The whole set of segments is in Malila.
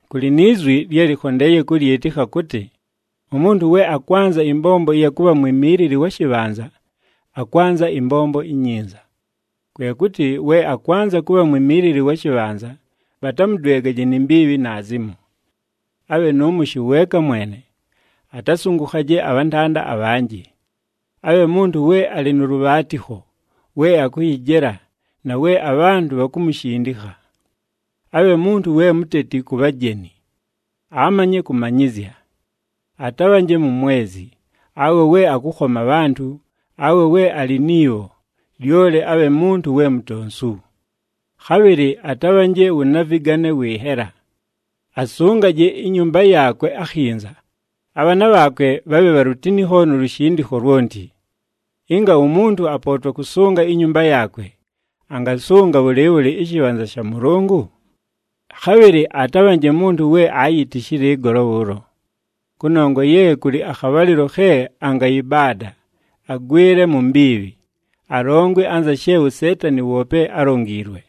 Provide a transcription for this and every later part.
Kʉlɨ ni zwi lye lɨkhondeeye kʉlyɨtɨkha kʉtɨ, “Umuntu we akwanza ɨmbombo ɨya kʉbha mwimiilili wa shɨbhanza, akwanza ɨmbombo inyinza.” Kwe kʉtɨ, we akwanza kʉbha mwimiilili wa shɨbhanza, bhatamʉdwegaje ni mbiibhi naazimo. Abhe nʉ mʉshɨ weeka mwene, atasʉngʉkhaje abhantanda abhanjɨ. Abhe muntu we alɨ nʉ lʉbhaatɨkho, we akʉyɨjela, na we abhantʉ bhakumushindikha. Abhe muntu we muteti ku bhajeni. Amanye kʉmanyɨzya. Atabhanje mumwezi, awe we akʉkhoma abhantʉ, awe we alɨ ni bho, lyoli abhe muntu we mutonsu. Khabhɨlɨ atabhanje wʉ navɨgane wɨ nhela. Asʉngaje inyumba yaakwe akhinza, abhaana bhaakwe bhabhe bha lutinikho nu lushindikho lwonti. Ɨnga umuntu apootwa kʉsʉnga inyumba yaakwe, angasʉnga bhʉlɨɨbhʉlɨ ɨshɨbhanza sha Mʉlʉngʉ? Khabhɨlɨ atabhanje muntu we aayitishile ɨgolo bhʉʉlo. Kʉnongwa ye kʉlɨ akhabhalɨlo khe angayɨbaada, agwɨle mu mbiibhi, alongwe anza she uSeetani woope álongiilwe.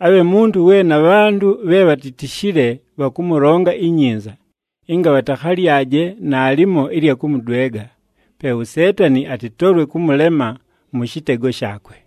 Abhe muntu we na bhantʉ bhe bhatitishile bhakʉmʉlonga inyinza, ɨnga bhatakhalyaje naalimo ɨlya kʉmʉdwega, pe uSeetani atɨtolwe kʉmʉlema mʉ shɨtego shaakwe.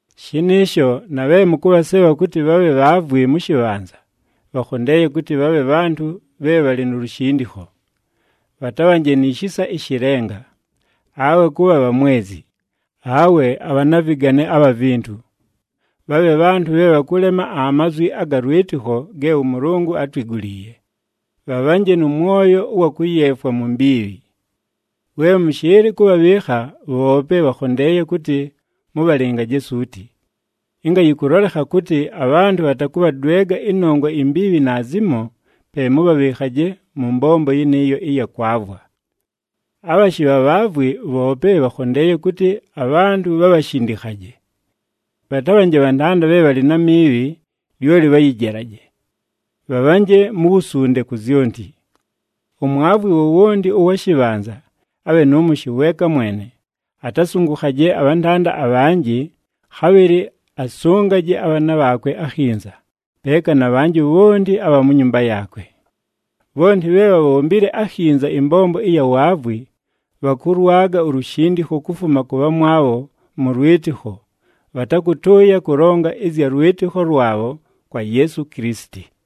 Shɨnɨɨsho na bhe mʉkʉbhasebha kʉtɨ bhabhe bhaavwi mʉ shɨbhanza, bhakhondeeye kʉtɨ bhabhe bhantʉ bhe bhalɨ nu lushindikho. Bhatabhanje ni shisa ɨshɨ lenga, awe kʉbha bhamwezi, awe abhanavɨgane abha vintu. Bhabhe bhantʉ bhe bhakʉlema amazwi aga lwɨtɨkho ge ʉMʉlʉngʉ átwiguliiye, bhabhanje nʉ mwoyo ʉwa kʉyeefwa mu mbiibhi. We mʉshɨɨlɨ kʉbhabhɨɨkha, bhoope bhakhondeeye kʉtɨ mʉbhalɨngaje suuti. Ɨnga yɨkʉlolekha kʉtɨ, abhantʉ bhatakʉbhadwega ɨnongwa imbiibhi naazimo, pe mʉbhabhɨɨkhaje mʉ mbombo yɨnɨɨyo ɨya kwavwa. Abhashɨ bha bhaavwi, bhoope bhakhondeeye kʉtɨ abhantʉ bhabhashindikhaje. Bhatabhanje bhantanda bhe bhalɨ na miibhi, lyoli bhayɨjelaje. Bhabhanje mu wusunde ku zyonti. Umwavwi wowonti ʉwa shɨbhanza abhe nʉ mʉshɨ weeka mwene, atasʉngʉkhaje abhantanda abhanjɨ, khabhɨlɨ asʉngaje abhaana bhaakwe akhinza, peeka na bhanjɨ bhonti abha mu nyumba yaakwe. Bhonti bhe bhabhombile akhinza ɨmbombo ɨya waavwi, bhakʉlwaga ulushindikho kufuma kʉ bhamwabho mʉ lwɨtɨkho, bhatakʉtʉʉya kʉlonga ɨzya lwɨtɨkho lwabho kwa Yeesu Kilisiti.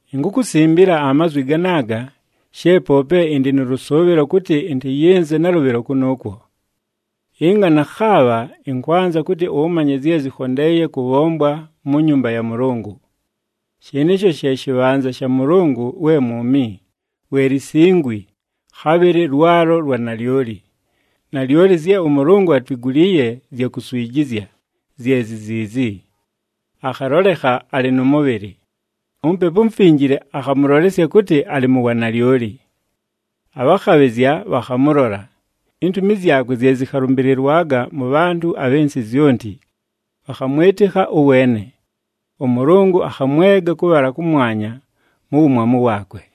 Inkukusimbila amazwi ganaaga she poope ɨndɨ nʉ lʉsʉʉbhɨlo kʉtɨ ɨntɨyɨnze nalʉbhɨlo kʉnʉʉkwo. Ɨnga nakhaabha, ɨnkwanza kʉtɨ ʉmanye zye zɨkhondeeye kʉbhombwa mu nyumba ya Mʉlʉngʉ. Shɨnɨɨsho she shɨbhanza sha Mʉlʉngʉ we mwumi, we lisingwi, khabhɨlɨ lwalo lwa nalyoli. Nalyoli zye ʉMʉlʉngʉ atwiguliiye zya kuswijizya, zye zi ziizi: Akhalolekha alɨ nʉ mʉbhɨlɨ, uMupepu uMufinjile akhamʉlolesya kʉtɨ alɨ mu wanalyoli. Abhakhabhɨzya bhakhamʉlola. Intumi zyakwe zye zɨkhalʉmbɨlɨlwaga mʉ bhantʉ abhɨ nsɨ zyonti, bhakhamwɨtɨkha ʉweene. ɄMʉlʉngʉ akhamwega kʉbhala kʉmwanya mu wumwamu waakwe.